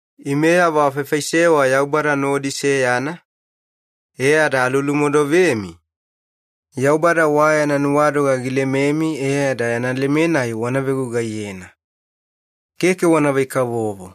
Imeyavo afaifaisewa Yaubada nodi seyana, e ada alulumodovemi, Yaubada wa yana nuwadoga gilememi e ada yana leme-nai wana vegugaiyena. Keke wanavai-kavovo.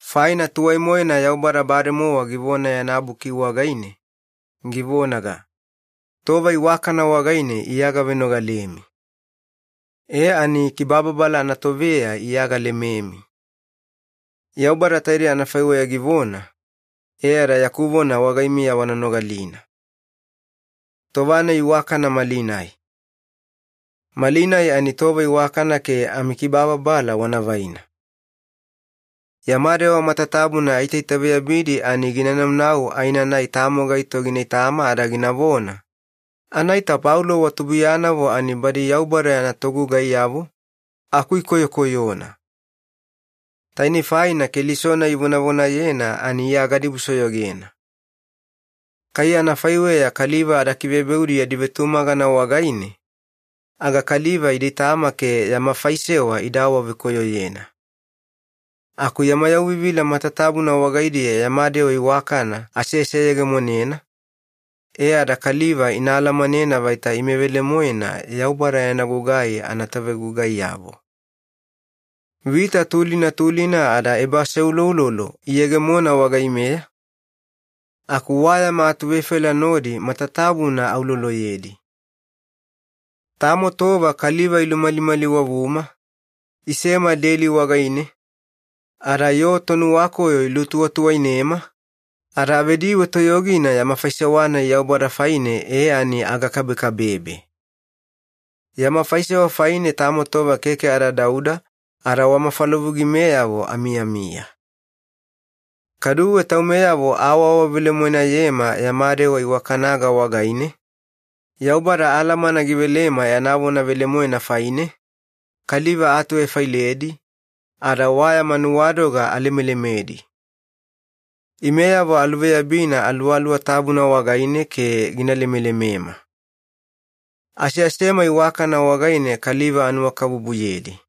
Faina tuwai-moena Yaubada bademowa givona yana Buki wagaine, givonaga, “Tova iwakana wagaine Iya gavenogalemi. E ani kibababala anatoveya Iya galememi.” Yaubada taidei anafaiweya givona, e ada yaku vona wagaimiya wana nogalina. Tova-nai iwakana malinai. Malinai ani tova iwakana ke amikibababala wana vaina. Yama dewa matatabuna aitaitaveyabidi ani gina naunau aenanai tamo gaito gina itama ada ginavona, “Anaita Paulo wa tubuiyanavo ani badi Yaubada yana togugaiyavo, aku ikoyokoyona. Taine faina Keliso-nai ivonavonayena ani Iya gadibusoyogena.” Kai anafaiweya kaliva ada kivebeudi yadi vetumagana wagaine, aga kaliva ida itama ke yama faisewa ida awavekoyoyena. Aku yama yauvivila matatabuna wagaidiya yama dewa iwakana aseseyegemonena, e ada kaliva ina alamanena vaita ime velemoena Yaubada yana gugai anavetogugaiyavo. Vita tulina tulina ada ebaaseuloulolo iyegemona wagaimeya, aku wa yama atuvefaila nodi matatabuna auloloyedi. Tamo tova kaliva ilumalimaliwavuma, isema deli wagaine, ada yoo tonuwakoyo ilutuwatuwainema, ada avediwe toyogina yama faisewa-nai Yaubada faine e ani agakabekabebe. Yama faisewa faine tamo tova keke ada dauda, ada wa mafalavugimeyavo amiyamiya. Kaduwe taumeyavo aawavelemoenayema yama dewa iwakanaga wagaine, Yaubada alamana givelema yana vona velemoena faine, kaliva aatuvefailedi, ada wa yama nuwadoga alemelemedi. Imeyavo aluveyabina Aluwaluwa Tabuna wagaine ke gina lemelemema. Aseasema iwakana wagaine kaliva anuwakabubuyedi.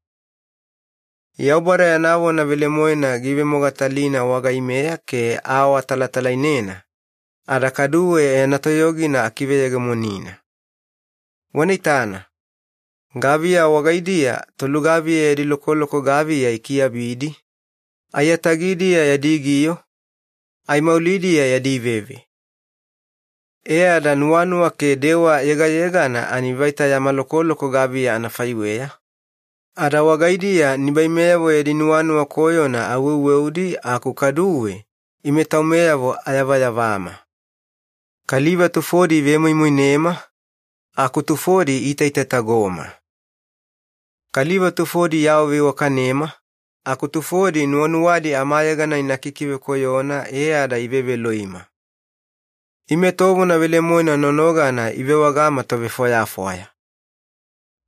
Yaubada yana vona velemoena giivemogatalina wagaimeya ke aawatalatalainena, ada kaduwe yana toyogina akiveyegemonina. Wana itana, gaviya wagaidiya tolugaviya yadi lokoloko gaviya ikiabidi, aiyatagidiya yadi giyo, aimaulidiya yadi veve. E ada nuwanuwa ke dewa yegayegana ani vaita yama lokoloko gaviya anafaiweya, ada wagaidiya nibaimeyavo yadi nuwanuwa koyona aweuweudi aku kaduwe ime taumeyavo ayavayavama. Kaliva tufodi ivemoimoinema, aku tufodi iitaitatagoma. Kaliva tufodi iawaveiwakanema, aku tufodi nuwanuwadi amayegana ina kikivekoyona e ada iveveloima. Ime tovona velemoena nonogana ivewagama tovefwayafwaya.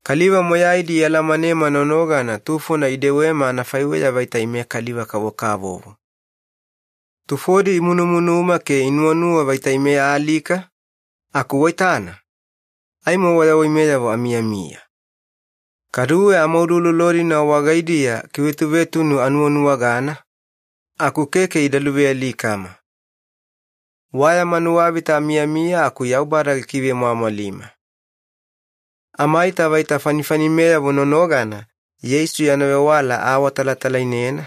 Kaliva moyaidi ialamanema nonogana tufona idewema anafaiweya vaita ime kaliva-kavokavovo. Tufodi imunumunuma ke inuwanuwa vaita ime aalika, aku waitana, aimo wayawaimeyavo amiyamiya. Kaduwe amauloulolo-dina wagaidiya kivetuvetunu anuwanuwagana, aku keke ida luvealikama. Wa yama nuwavita amiyamiya aku Yaubada gikivemwamwalima. Amaita vaita fanifanimeyavo nonogana Yeisu yana vewala aawatalatalainena,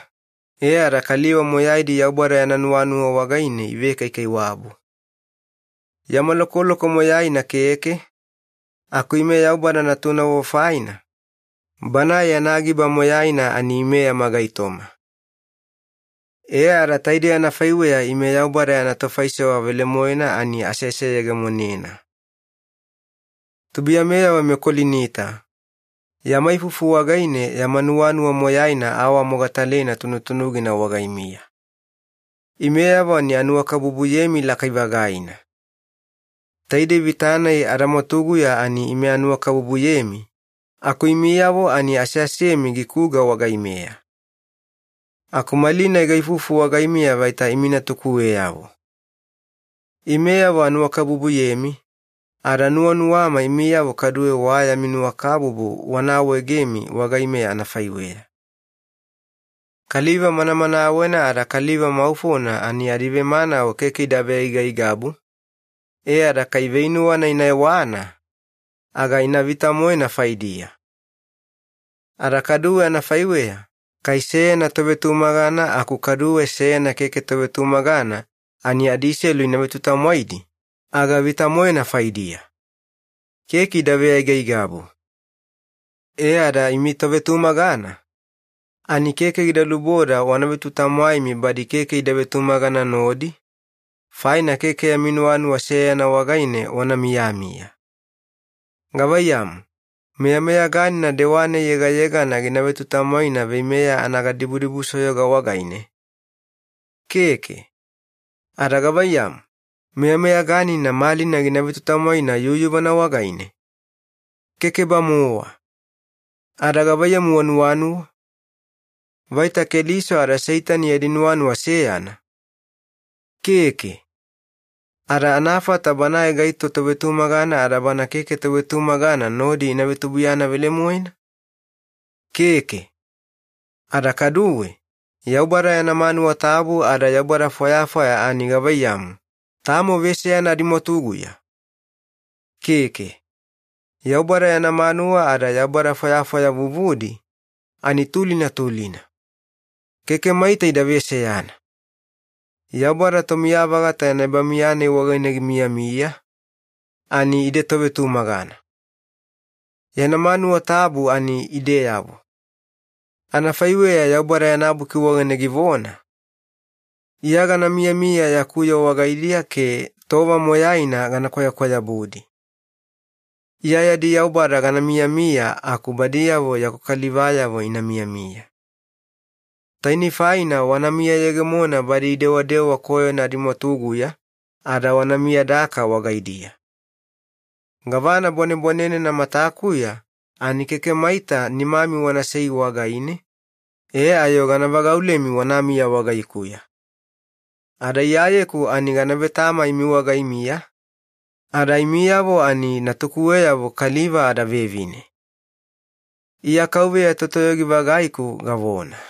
e ada kaliva moyaidi Yaubada yana nuwanuwa wagaine ivekaikaiwabu. Yama lokoloko moyaina keke, aku ime Yaubada natunavo faina, Banae yana giba moyaina ani ime yama gaitoma. E ada taidei anafaiweya ime Yaubada yana tofaisewa velemoena ani aseseyegemonena. Tubuiyameyavo meKolinita, yama ifufu wagaine yama nuwanuwa moyaina aawamogatalena tunutunugina wagaimiya. Imeyavo ani anuwakabubuyemi lakai-vagaina. Taidei vita-nai adamwatuguya ani ime anuwakabubuyemi, aku imiyavo ani aseasemi gikuga wagaimeya. Aku malinai gaifufu wagaimiya vaita imi natukuweyavo. Imeyavo anuwakabubuyemi, ada nuwanuwama imiyavo kaduwe wa yami nuwakabubu wana awaegemi wagaimeya anafaiweya. Kaliva manamanawena ada kaliva maufona ani adivemanawe keke ida veaigaigabu, e ada kai veinuwana ina ewana, aga ina vita-moena faidiya. Ada kaduwe anafaiweya, kai seyana tovetumagana aku kaduwe seyana keke tovetumagana ani adiselu ina vetutamwaidi, aga vita-moena faidiya. Keke ida veaigaigabu. E ada imi tovetumagana, ani keke gida luboda wana vetutamwaimi badi keke ida vetumagana nodi, faina keke yami nuwanuwa seyana wagaine wana miyamiya. Gavaiyamu, meyameyaganina dewa-nai yegayegana gina vetutamwaina veimeya anagadibudibusoyoga wagaine? Keke. Ada gavaiyamu, meyameyaganina malina gina vetutamwaina yuyuvana wagaine? Keke-bamowa. Ada gavaiyamu wanuwanuwa? Vaita Keliso ada Seitani yadi nuwanuwa seyana? Keke. Ada anafata banae gaito tovetumagana ada bana keke tovetumagana nodi ina vetubuiyana velemoena? Keke. Ada kaduwe, Yaubada yana manuwa tabu ada yaubada fwayafwaya ani gavaiyamu, tamo veseyana adimwatuguya? Keke. Yaubada yana manuwa ada yaubada fwayafwaya vuvudi, ani tulina tulina. Keke maita ida veseyana. Yaubada Tomiya-vagata yana ebamiya-nai wagaine gimiyamiya, ani ide tovetumagana. Yana manuwa tabu ani ideyavo. Anafaiweya Yaubada yana Buki wagaine givona, “Iya gana miyamiya yaku yoo wagaidiya ke tova moyaina gana kwayakwayabudi. Iya yadi Yaubada gana miyamiya aku badiyavo yaku kalivayavo ina miyamiya.” Tainei faina “wana miyayegemona badi idewadewa koyona adimwatuguya, ada wana miyadaka wagaidiya. Gavana bwanebwanenena matakuya ani keke maita nimami wanasei wagaine, e ayo gana vagaulemi wanamiya wagaikuya. Ada Iyayeku ani gana vetama imi wagaimiya, ada imiyavo ani natukuweyavo kaliva ada vevine. Iya KAUVEYA Totoyogi-vagaiku gavona.”